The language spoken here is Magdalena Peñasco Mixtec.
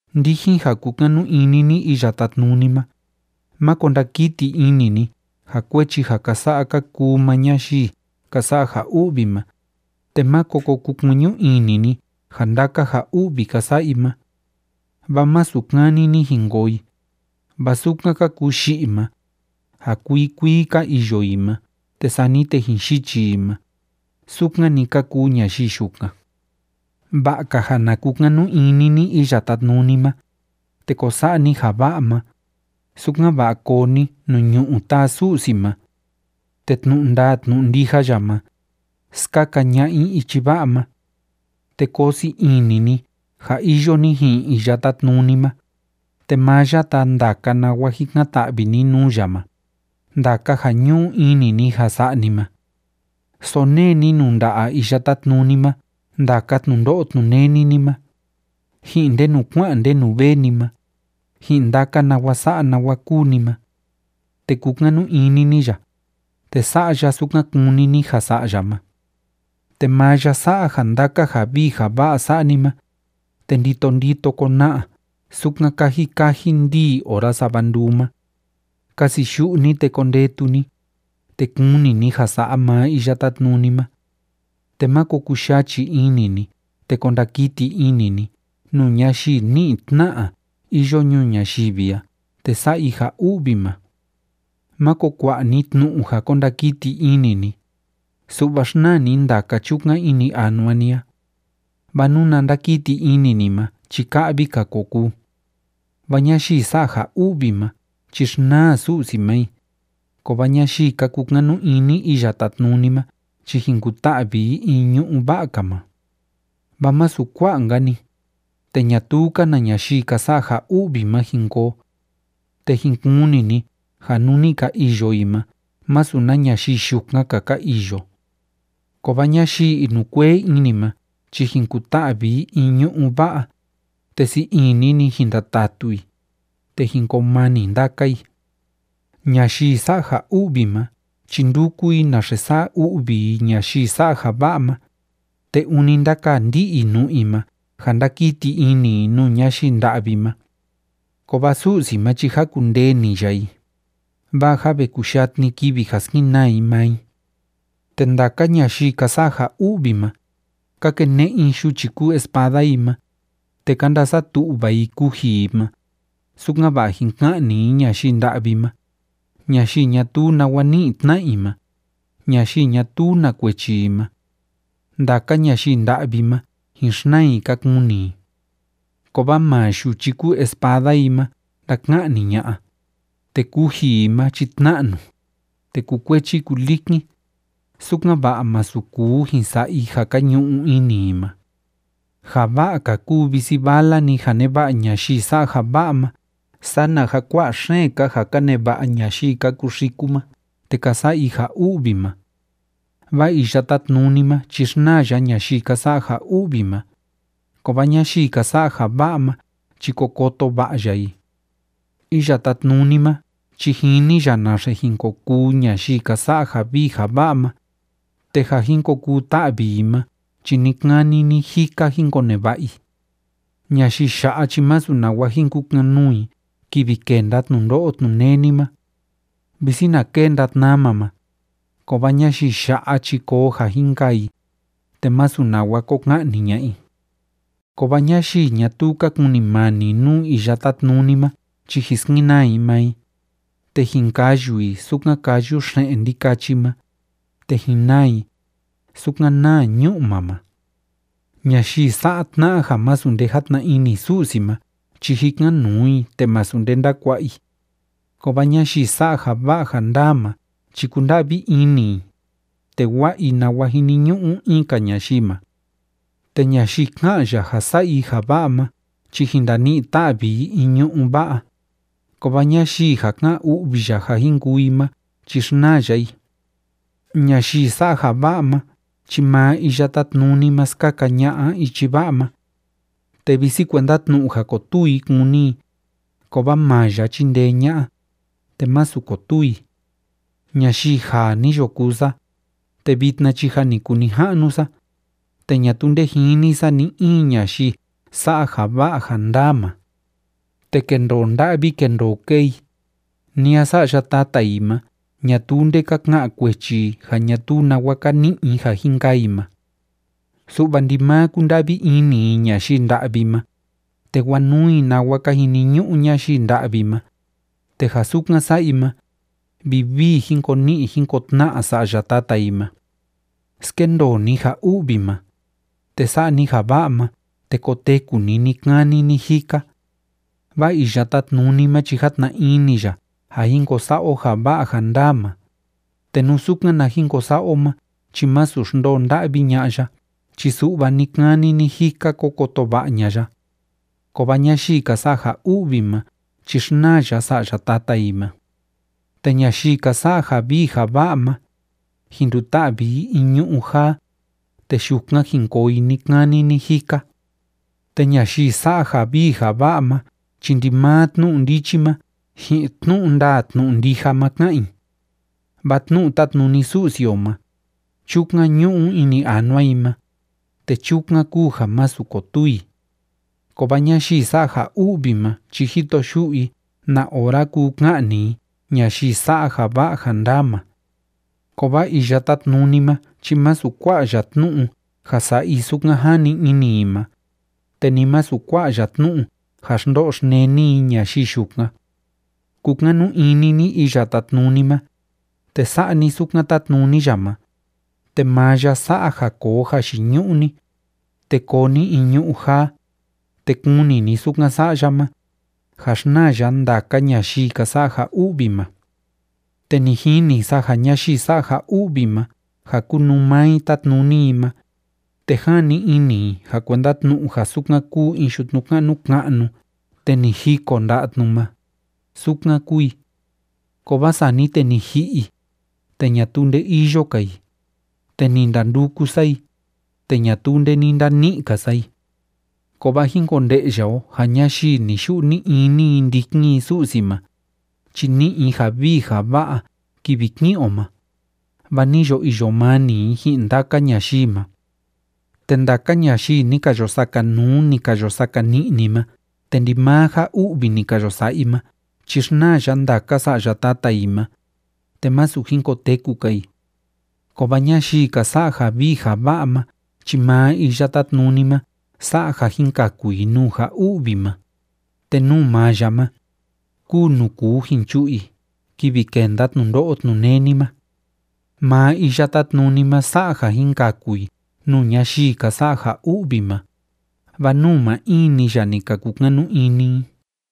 Ndijin ja kúkanu ini ni Iya Tátnuni ma, máko ndakiti ini ni ja kuechi ja ka sa'a ka kuu maa ñayii ka sa'a ja u'vi ma, te máko ko kukueñu ini ni ja ndaka ja u'vi ka sa'a i ma. Vaa masu kani‑ni jin koo i, vaa sukan ka kuu yi'i ma, ja kuii kuii ka iyo i ma te sani te jin yichi i ma, sukan‑ni ka kuu ñayii yukan. Va'a‑ka ja na kukanu ini ni Iya Tátnuni ma, te ko sa'a ni ja va'a ma, sukan‑va'a koo ni nuu ñu'ú taa Su'si ma. Te tnu'u ndaa tnu'u ndija ya ma, skaka ña'a i ichi va'a ma. Te koo sii ini ni ja iyo ni ji'in Iya Tátnuni ma, te maa ya taa ndaka nawa jikan‑ta'vi ni nuu ya ma, ndaka ja ñu'u ini ni ja sa'a ni ma. Sonee ni nuu nda'a Iya Tátnuni ma ndaka tnundo'o tnuneni ni ma, ji'in ndenu kua'an ndenu vee ni ma, ji'in ndaka nawa sa'a nawa kúu ni ma. Te kukanu ini ni ya, te sa'a ya sukan kúni ni ja sa'a ya ma. Te maa ya sa'a ja ndaka ja vii ja va'a sa'a ni ma, te ndito ndito kona'a sukan kaji kaji ndíi ora sava nduu ma. Kasiyu'u ni, te kondetu ni, te kuni ni ja sa'a maa Iya Tátnuni ma. Te máko kuyachi ini ni te ko ndakiti ini ni nuu ñayii ni'i tna'a iyo ñuu ñayivi a te sa'a i ja u'vi ma. Máko kua'a ni tnu'u ja ko ndakiti ini ni, su'va xnaa ni ndaka chukan ini anua ni a. Vaa nuna ndakiti ini ni ma chi ka'vi‑ka ko kuu. Vaa ñayii sa'a ja u'vi ma chi xnaa Su'si ma i, kovaa ñayii ka kukanu ini Iya Tátnuni ma chi jin kuta'vi i in ñu'ú va'a‑ka ma. Vaa masu kua'a‑nka‑ni, te ñatuu‑ka na ñayii ka sa'a ja u'vi ma jin koo. Te jin kuni ni ja nuu ni ka iyo i ma másu na ñayii yukan‑ka ka iyo. Kovaa ñayii inukuee ini ma chi jin kuta'vi i in ñu'ú va'a, te sii ini‑ni jin ndatatu i, te jin koo mani ndaka i. Ñayii sa'a ja u'vi ma chi ndúku i naxe sa'a u'vi i ñayii sa'a ja va'a ma, te ûni ndákaa ndi'i i nu'u i ma ja ndákiti ini i nuu ñayii nda'vi ma. Kovaa Su'si ma chi jákundee‑ni ya i, vaa jâ ve kuyatni kivi ja skenaa i maa i. Te ndaka ñayii ka sa'a ja u'vi ma, ka kene'e i yuchi kúu espada i ma, te ka ndasatu'va i kuji i ma, sukan‑va'a jin ka'ni i ñayii nda'vi ma, ñayii ñatuu nawa ni'i tna'a i ma, ñayii ñatuu na kuechi i ma. Ndaka ñayii nda'vi ma jin xnaa i ka kuni i. Kovaa maa yuchi kúu espada i ma ndaka'ni ña'a, te kuji i ma chi tna'nu, te kukuechi kulikin, sukan‑va'a masu kuu jin sa'a i ja ka ñu'u ini i ma. Ja va'a‑ka kúu visi vala‑ni ja neva'a ñayii sa'a ja va'a ma sana ja kua'a xeen‑ka ja ka neva'a ñayii ka kuxiku ma te ka sa'a i ja u'vi ma. Vaa Iya Tátnuni ma chi xnaa ya ñayii ka sa'a ja u'vi ma, kovaa ñayii ka sa'a ja va'a ma chi ko koto va'a ya i. Iya Tátnuni ma chi jini ya naxe jin ko kuu ñayii ka sa'a ja vii ja va'a ma, te ja jin ko kuu ta'vi i ma chi ni‑kani ni‑jika jin koneva'a i. Ñayii ya'a chi masu nawa jin kukan‑nuu i kivi kenda tnundo'o tnuneni ma. Visi na kenda tnama ma, kovaa ñayii ya'a chi koo ja jin kaa i, te masu nawa ko ka'ni ña'a i. Kovaa ñayii ñatuu ka kunimani nuu Iya Tátnuni ma chi jin skenaa i maa i, te jin kayu i, sukan káyu xe'en ndikachi ma, te jin naa i, sukan náa ñu'ma ma. Ñayii sa'a tna'a ja másu nde játna ini Su'si ma chi jikan‑nuu i, te masu nde ndákua'a i. Kovaa ñayii sa'a ja va'a ja ndaa ma chi kúnda'vi ini i, te wa'a i nawa jiniñu'u in‑ka ñayii ma. Te ñayii ká'an ya ja sa'a i ja va'a ma chi jin ndani'i ta'vi i in ñu'ú va'a, kovaa ñayii ja ká'an u'vi ya ja jin kuu i ma chi xnaa ya i. Ñayii sa'a ja va'a ma chi maa Iya Tátnuni ma skaka ña'a ichi va'a ma. Te visi kuenda tnu'u ja kotuu i kúni i, kovaa maa ya chindee ña'a, te masu kotuu i. Ñayii jaa ni yo kuu sa, te vitna chi jâ ni kuu nija'nu sa, te ñatuu nde jini sa ni‑in ñayii sa'a ja va'a ja ndaa ma, te kendoo nda'vi kendoo kee i, ni a sa'ya tata i ma, ñatuu nde ka ka'an kuechi i ja ñatuu nawa ka ni'i i ja jin kaa i ma. Su'va ndimaa kúnda'vi ini i ñayii nda'vi ma, te wanuu i nawa ka jiniñu'u ñayii nda'vi ma, te ja sukan sa'a i ma, vivii jin ko ni'i jin ko tna'a sa'ya tata i ma. Skendoo ni ja u'vi ma, te sa'a ni ja va'a ma, te koteku ni ni‑kani ni‑jika. Vaa Iya Tátnuni ma chi játna ini ya ja jin ko sa'a o ja va'a ja ndaa ma, te nú sukan na jin ko sa'a o ma chi másu xndoo nda'vi ña'a ya chi su'va ni‑kani ni‑jika ko koto va'a ña'a ya. Kovaa ñayii ka sa'a ja u'vi ma chi xnaa ya sa'ya tata i ma. Te ñayii ka sa'a ja vii ja va'a ma, jin nduta'vi i in ñu'ú jaa, te yukan jin koo i ni‑kani ni‑jika. Te ñayii sa'a ja vii ja va'a ma chi ndimaa tnu'u ndichi ma ji'in tnu'u ndaa tnu'u ndija ma ká'an i. Vaa tnu'u tátnuni Su'si o ma, chukan ñu'u ini anua i ma, te chukan kúu ja masu kotuu i. Kovaa ñayii sa'a ja u'vi ma chi jito yu'u i na ora kuu ka'ni i ñayii sa'a ja va'a ja ndaa ma. Kovaa Iya Tátnuni ma chi masu kua'a ya tnu'u ja sa'a i sukan jani ini i ma, te ni masu kua'a ya tnu'u ja xndo'o xneni i ñayii yukan. Kukanu ini ni Iya Tátnuni ma, te sa'a ni sukan tátnuni ya ma, te maa ya sa'a ja koo jayiñu'u ni, te koo ni in ñu'ú jaa, te kuni ni sukan sa'a ya ma, ja xnaa ya ndaka ñayii ka sa'a ja u'vi ma. Te ni jini sa ja ñayii sa'a ja u'vi ma ja kúnuu maa i tátnuni i ma, te jani ini i ja kuenda tnu'u ja sukan kúu in yutnu ka'nu ka'nu te ni jiko nda'a tnu ma, sukan kúu i. Kovaa sani te ni ji'i i, te ñatuu nde iyo‑ka i, te ni ndanduku sa i, te ñatuu nde ni ndani'i‑ka sa i. Kovaa jín konde'ya o ja ñayii ni‑yu'u ni‑ini i ndikin i Su'si ma, chi ni'i i ja vii ja va'a kivi ki'in o ma, vaa ni yo iyo mani i ji'in ndaka ñayii ma. Te ndaka ñayii ni ka yo sakanuu, ni ka yo sakani'ni ma te ndimaa ja u'vi ni ka yo sa'a i ma chi xnaa ya ndaka sa'ya tata i ma, te masu jin koteku‑ka i. Kovaa ñayii ka sa'a ja vii ja va'a ma chi maa Iya Tátnuni ma sa'a ja jin kaku i nuu ja u'vi ma, te nuu maa ya ma, kúu nuu kuu jin chu'u i kivi kenda tnundo'o tnuneni ma. Maa Iya Tátnuni ma sa'a ja jin kaku i nuu ñayii ka sa'a ja u'vi ma, vaa nuu maa in‑ni ya ni ka kukanu ini i.